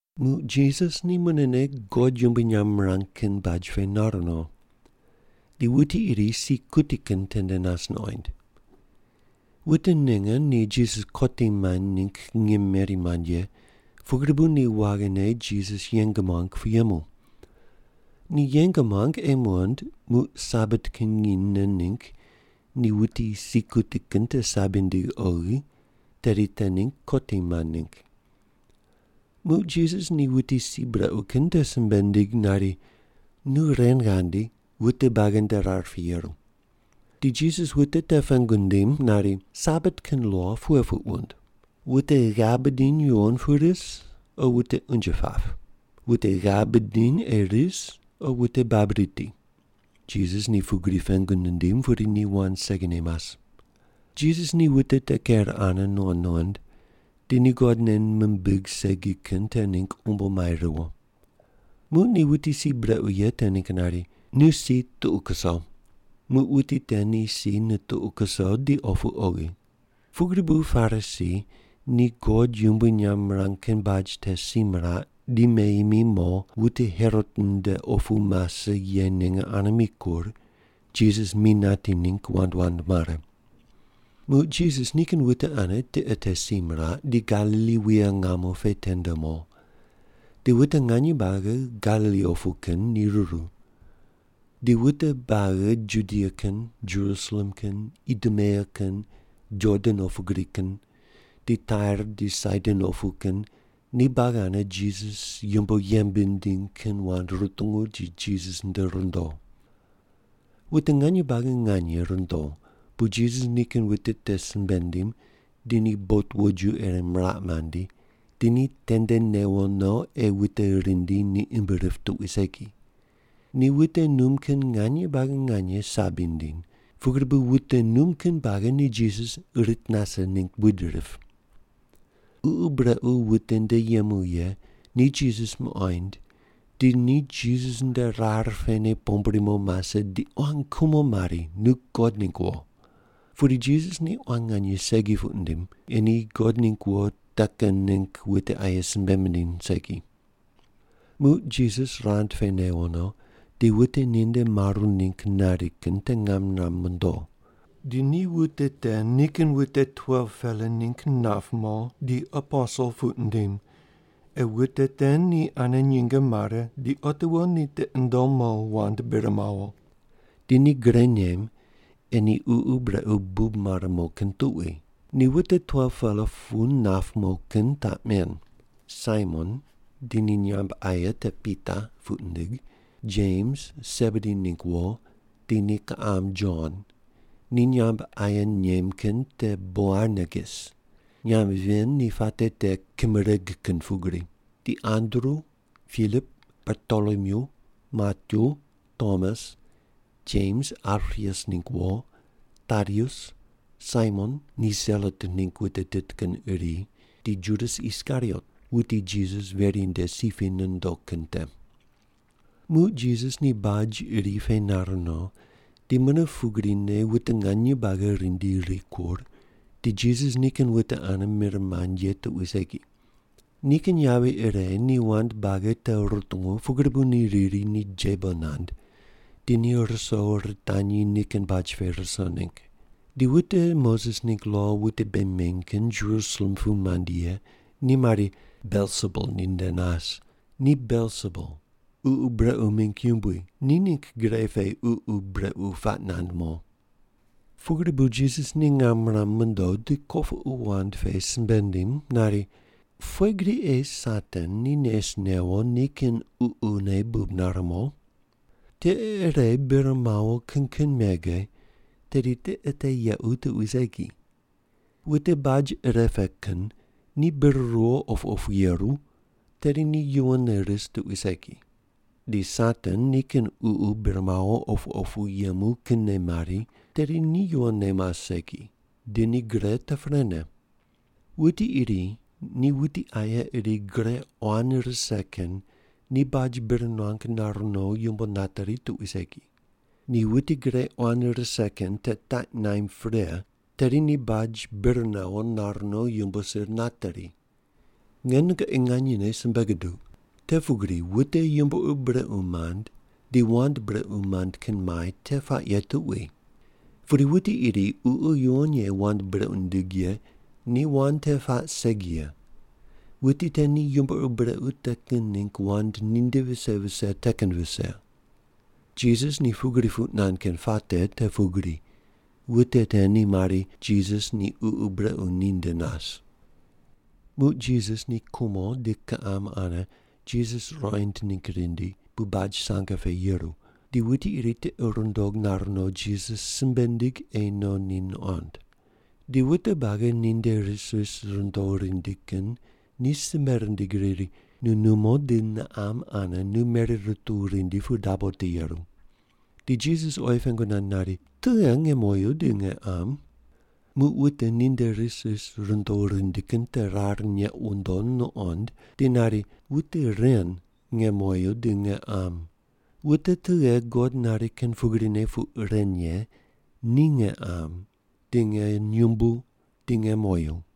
Muq Jisas ni munene God yumbui nyamb mirang kin baj pe nar no. Di wuti iri si kuti kin tende nas nuqoind. Wute ninge ni Jisas kotim maind ningg ngim meri mand ye, pugri bu ni waghine Jisas yeng muang pu yemu. Ni yeng muang ei muqond muq Sabat kin nginy nen ningg ni wuti si kuti kin te sabi nindig oghi, tedi te ningg kotim maind ningg. Muq Jisas ni wuti si brequ kin te simbe nindig nari, “Nu ren ghandi wute buagi nde rar pe yeru.” Di Jisas wute te pengu nindim nari, “Sabat kin lo pughe puq wund? Wute ghav bidiny yuwon pu ris, o wute unje pap? Wute ghav bidiny ei ris o wute bab riti?” Jisas ni pugri pengu nindim, pudi ni wand segine mas. Jisas ni wute te ker ane nuqond nuqond, di ni God nei mimbig segi kin te ningg umbo mai riwo. Muq ni wuti si brequ ye te ningg nari, “Nu si tuqu kuso.” Muq wuti te ni si nituqu kuso di opu oghi. Pugri bu Parisi ni God yumbui nyamb mirang kin baj te si miraq di meyi mi mo, wute Herot nde opu mase ye ninge ane mikur, Jisas mi nati ningg wand wand mare. Muq Jisas nikin wute ane tiqe te si miraq, di Galili wuye ngamo pe tende mo. Di wute nganye buagi Galili opu kin ni ruru. Di wute buagi Judia kin, Jerusalem kin, Idumea kin, Jordan opu gri kin, di Tair di Saidon opu kin ni buagi ane Jisas yumbo yembe nindiny kin wand rutungu di Jisas nde rundo. Wute nganye buagi nganye rundo, bu Jisas nikin wute te simbe nindim di ni bot woju ire miraq mandi, di ni tende newo no ei wute rindi ni imb rip tuqui segi. Ni wute num kin nganye buagi nganye sabi nindiny, pugri bu wute num kin buagi ni Jisas rit nase ningg buid rip. Ququ brequ wute nde yemu ye ni Jisas muqoind, di ni Jisas nde rar pene pombri mo mase di quan kumo mari, “Nu God ningg wo.” Pudi Jisas ni quan nganye segi puq nindim ei ni God ningg wo te kin ningg wute aye simbe mindiny segi. Muq Jisas ni rand pe newo no, di wute ninde maru ningg nari kin te ngam niram mondo. Di ni wute te nikin wute 12-pela ningg nap mo di aposel puq nindim, ei wute te ni ane nyinge mare di otiwo ni tiqi nundom mo wand bir mawo. Di ni gre nem ei ni ququ brequ bub mare mo kin tuqui. Ni wute 12-pela pu nap mo kin taq men: Saimon, di ni nyamb aye te Pita puq nindig. Jems, Sebedi ningg wo, di ni kiqam Jon, ni nyamb aye nem kin te Boanerges. (Nyamb ven ni puate te “Kimereg kin pugri.”) Di Andru, Pilip, Bartolomyu, Matyu, Tomas, Jems Alpius ningg wo, Tadius, Saimon ni Selot ningg wute tit kin iri, di Judas Iskariot, wuti Jisas veri nde si pe ni nondo kin te. Muq Jisas ni baj iri pe nar no, di mune pugrine wute nganye buagi rindi rikur, di Jisas nikin wute ane mir mand ye tuqui segi. Nikin yavi ire ni wand buagi te rutungu pugri bu ni riri ni jebo nand di ni ruso ritanyi nikin baj pe ruso ningg. Di wute Moses ningg lo wute bei meny kin Jerusalem pu mandi ye ni mari, “Belsebul ninde nas. Ni Belsebul, ququ brequ mingg yumbui, ni ningg gre pe ququ brequ puaq nand mo.” Pugri bu Jisas ni ngam niram mondo, di kopuqu wand pe simbe nindim nari, “Pughe gri ei Satan ni nes newo nikin ququne bub nare mo? Tiqe ire bir mawo kin kin mege, tedi tiqe te yequ tuqui segi. Wute baj ire pe kin ni bir ruwo opu opu yeru, tedi ni yuwonne ris tuqui segi. Di Satan nikin ququ bir mawo opu opu yemu kinne mari, tedi ni yuwonne mas segi, di ni gre te prene. Wuti iri ni wuti aye iri gre quan rise kin ni baj bir nuang nar no yumbo nateri tuqui segi. Ni wuti gre quan rise kin te taq naimb pre, tedi ni baj bir nawo nar no yumbo sir nateri. Nge nungoqi nganyene simbe guduq. Te pugri wute yumbo ur brequ mand di wand brequ mand kin mai te puaq ye tuqui. Pudi wuti iri Ququ Yuwon Ye wand brequ nindig ye ni wand te puaq segi ye, wuti te ni yumbo ur brequ te kin ningg wand ninde vise vise te kin vise.” Jisas ni pugri puq nand kin puate te pugri, wute te ni mari, “Jisas ni ququ brequ ninde nas.” Muq Jisas ni kumo di kiqam ane Jisas ruqoind ningg rindi pu baj sange pe yeru, di wuti iri tiqi rundog nar no Jisas simbe nindig ei no ni nuqond. Di wute buagi ninde ris ris rundo rindi kin ni simbe rindig riri, “Nu numo di niqam ane nu meri rutuw rindi pu dabo te yeru.” Di Jisas oyi pengu nand nari, “Tughe nge moyu di nge qam?” Muq wute ninde ris ris rundo rindi kin te rar neq wundo nuqond di nari, “Wute ren nge moyu di nge qam. Wute tughe God nari kin pugrine puq ren ye ni nge qam di nge nyumbu di nge moyu.”